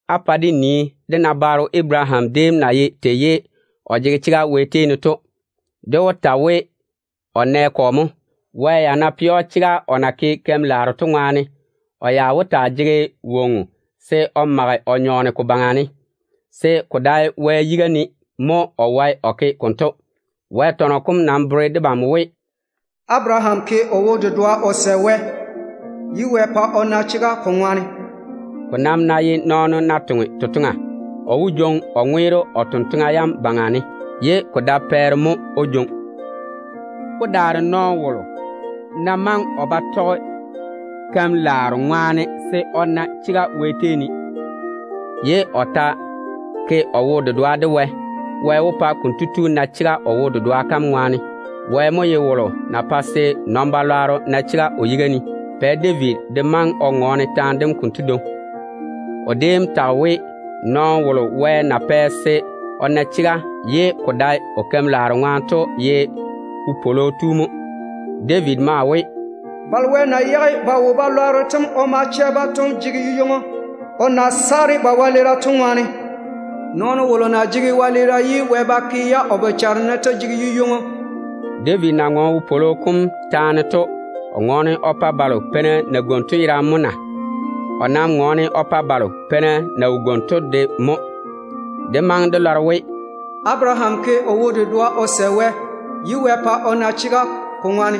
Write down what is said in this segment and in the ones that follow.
Á pa dé nii dé nabaaro Abaraham déem na ye tei ye o jege chega Wɛ tei ne to. Dé wó ta we o nɛ kɔ mo? Wɛ ya ná pɛ‑o chega o na ke keim-laaro to ŋwaane, o ya wó taa jege woŋo se o mage o nyɔɔne ko baŋa ne, se ko dae Wɛ yiga ne mo o wae o ke konto. Wɛ tɔnɔ kom nam bere debam we, “Abaraham sɛ Wɛ de wo-dedoa, ye Wɛ pa o na chega ko ŋwaane.” Ko nam ná ye nɔɔno ná toŋe totoŋa, o wó jwoŋi o ŋweero o totoŋa yam baŋa ne, ye ko dae pɛɛre mo o jwoŋi. Ko daare nɔɔno wolo ná maŋe o ba tɔge keim-laaro ŋwaane se o na chega Wɛ tei ne, ye o ta ke o wo-dedoa de Wɛ, Wɛ wó pa konto tu na chega o wo-dedoa kam ŋwaane. Wɛ mo ye wolo na pae se wɛ-lwɛɛna na chega o yiga ne. Pɛ David de maŋe o ŋɔɔne taane dento dwoŋi. O déem tage we, nɔɔno wolo Wɛ na pɛ se o na chega ye ko dae o keim-laaro ŋwaane to ye wopwolo tu mo. David maa we: “Balo Wɛ na yage ba wo-balwaaro tem o ma chɛ-ba to jege yu-ywoŋo, o na saare ba wɛleera to ŋwaane. Nɔɔno wolo na jege wɛleera ye Wɛ ba ke-ya o bochare ne to jege yu-ywoŋo.” David na ŋɔɔne wopwolo kom taane to, o ŋɔɔne o pa balo peina na gwoni to yerane mo na? O nam ŋɔɔne o pa balo peina na wo gwoni to de mo. Dé maŋe dé lɔre we, “Abaraham ke o wo-dedoa o sɛ Wɛ, ye Wɛ pa o na chega ko ŋwaane.”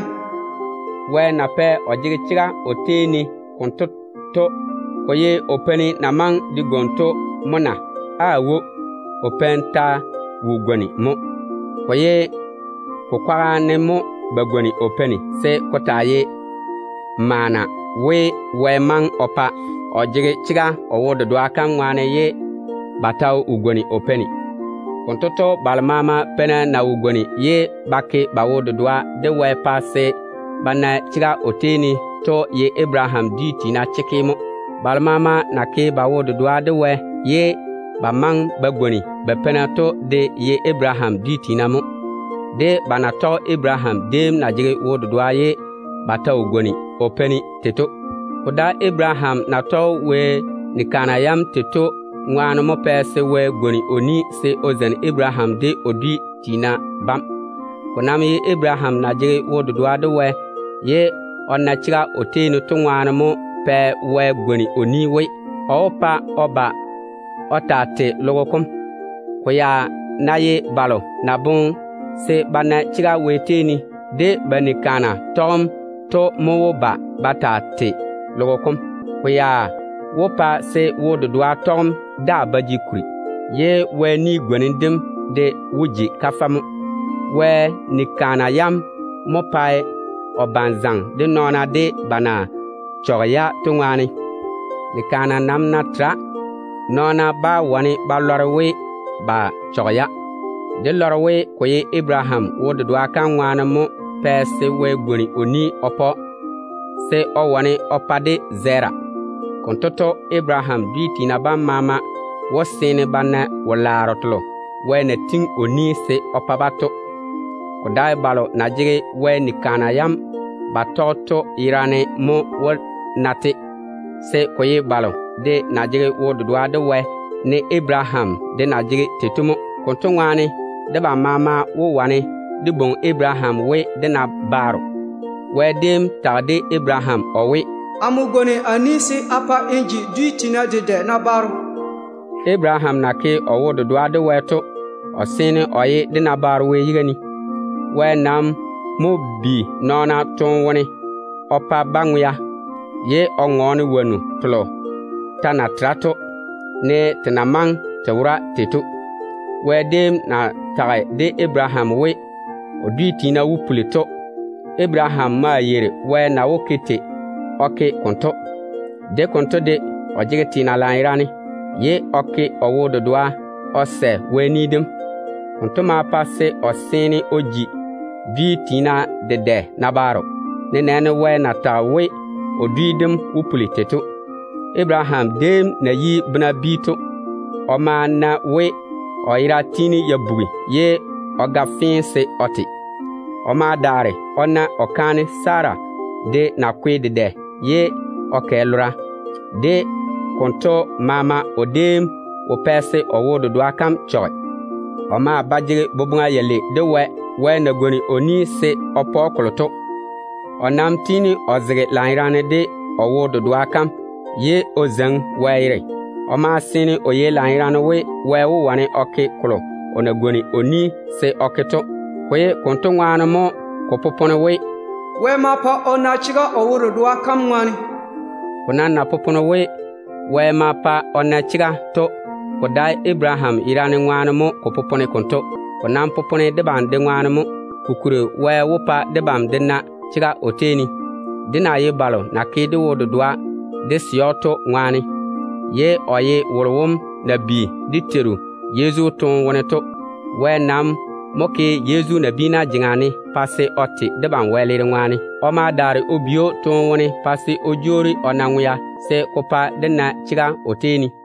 Wɛ na pɛ o jege chega o tei ne konto to, ko ye o peini na maŋe de gwoni to mo na? Aawo, o peini ya ta wo gwoni mo. Ko ye ko kwaga ne mo ba gwoni o peini se ko taa ye maana we Wɛ maŋe o pa o jege chega o wo-dedoa kam ŋwaane ye ba ta wo gwoni o peini. Konto to, balo maama peina na wo gwoni ye ba ke ba wo-dedoa de Wɛ pa se ba na chega o tei ne to ye Abaraham dwi tiina chekke mo. Balo maama na ke ba wo-dedoa de Wɛ ye ba maŋe ba gwoni ba peina to de ye Abaraham dwi tiina mo, de ba na tɔge Abaraham déem na jege wo-dedoa ye ba ta wo gwoni o peini tei to. Ko dae Abaraham na tɔge Wɛ ni-kaana yam tei to ŋwaane mo pɛ se Wɛ pwooli se o zeini Abaraham de o dwi tiina bam. Ko nam ye Abaraham na jege wo-dedoa de Wɛ ye o na chega o tei ne to ŋwaane mo pɛ Wɛ pwooli we, o wó pa o ba o taa tei logo kom. Ko ya ná ye balo na boŋe se ba na chega Wɛ tei ne de ba ni-kaana tɔgem to mo wó ba ba taa tei logo kom, ko ya wó pa se wo-dedoa tɔgem daa ta ba jege kuri, ye Wɛ kampwola kam de wó ji kafɛ mo. Wɛ ni-kaana yam mo pae o bane zaŋe de nɔɔna de ba na chɔge-ya to ŋwaane. Ni-kaana nam ná tera, nɔɔna bá wane ba lɔre we ba chɔge-ya. Dé lɔre we ko ye Abaraham wo-dedoa kam ŋwaane mo pɛ se Wɛ pwooli kampwola ded‑o, se o wane o pa-ka zɛɛra. Konto to, Abaraham dwi tiina bam maama wó seene ba na wo-laaro telo Wɛ na tiŋi o ni se o pa-ba to. Ko dae balo na jege Wɛ ni-kaana yam ba tɔge to yerane mo wó na-te, se ko ye balo de na jege wo-dedoa de Wɛ ne Abaraham de na jege tei to mo. Konto ŋwaane, debam maama wó wane dé bwoŋi Abaraham we dé nabaaro. Wɛ déem tage de Abaraham o we, “Amo gwoni a ni se a pa n ji dwi tiina dedɛ nabaaro.” Abaraham na ke o wo-dedoa de Wɛ to, o seene o ye dé nabaaro Wɛ yiga ne. Wɛ nam mo bi nɔɔna toone wone o pa-ba ŋwea, ye o ŋɔɔne wonnu telo ta na tera to, ne te na maŋe te wora tei to. Wɛ déem na tage de Abaraham we, o dwi tiina wó puli to, Abaraham maa yeiri Wɛ na wó ke tei o ke konto. De konto de, o jege teena lanyerane, ye o ke o wo-dedoa o sɛ Wɛ ni dem. Konto ma pa se o seene o ji dwi tiina dedɛ nabaaro, nenɛɛne Wɛ na tage we o dwi dem wó puli tei to. Abaraham déem na yi bena bi to, o ma na we o yera tiini ya bugi ye o ga fee se o te. O ma daare o na o kaane Sara de na kwe dedɛ ye o kɛ lora to. De konto maama o déem wo pɛ se o wo-dedoa kam chɔge. O maa ba jege boboŋa yalei de Wɛ na pwooli se o pa‑o kolo to. O nam tiini o zege lanyerane de o wo-dedoa kam mo, ye o zeiŋi Wɛ yere. O maa seene o yei lanyerane we, Wɛ wó wane o ke kolo o na pwooli se o ke to. Ko ye konto ŋwaane mo ko popone we, “Wɛ ma pa o na chega o wo-dedoa kam ŋwaane.” Ko nam na popone we, “Wɛ ma pa o na chega” to, ko dae Abaraham yerane ŋwaane mo ko popone konto. Ko nam popone debam de ŋwaane mo. Kokuri, Wɛ wó pa debam de na chega o tei ne, dé na ye balo na ke dé wo-dedoa dé sɛ‑o to ŋwaane. Wonto nam mo ye wolo na bi dé Teiru Yezu toone wone to. Wɛ nam mo ke Yezu nabiina jeŋa ne pa se o te debam wɛleera ŋwaane. O ma daare o bi‑o toone wone pa se o jwoori o na ŋwea, se ko pa dé na chega o tei ne.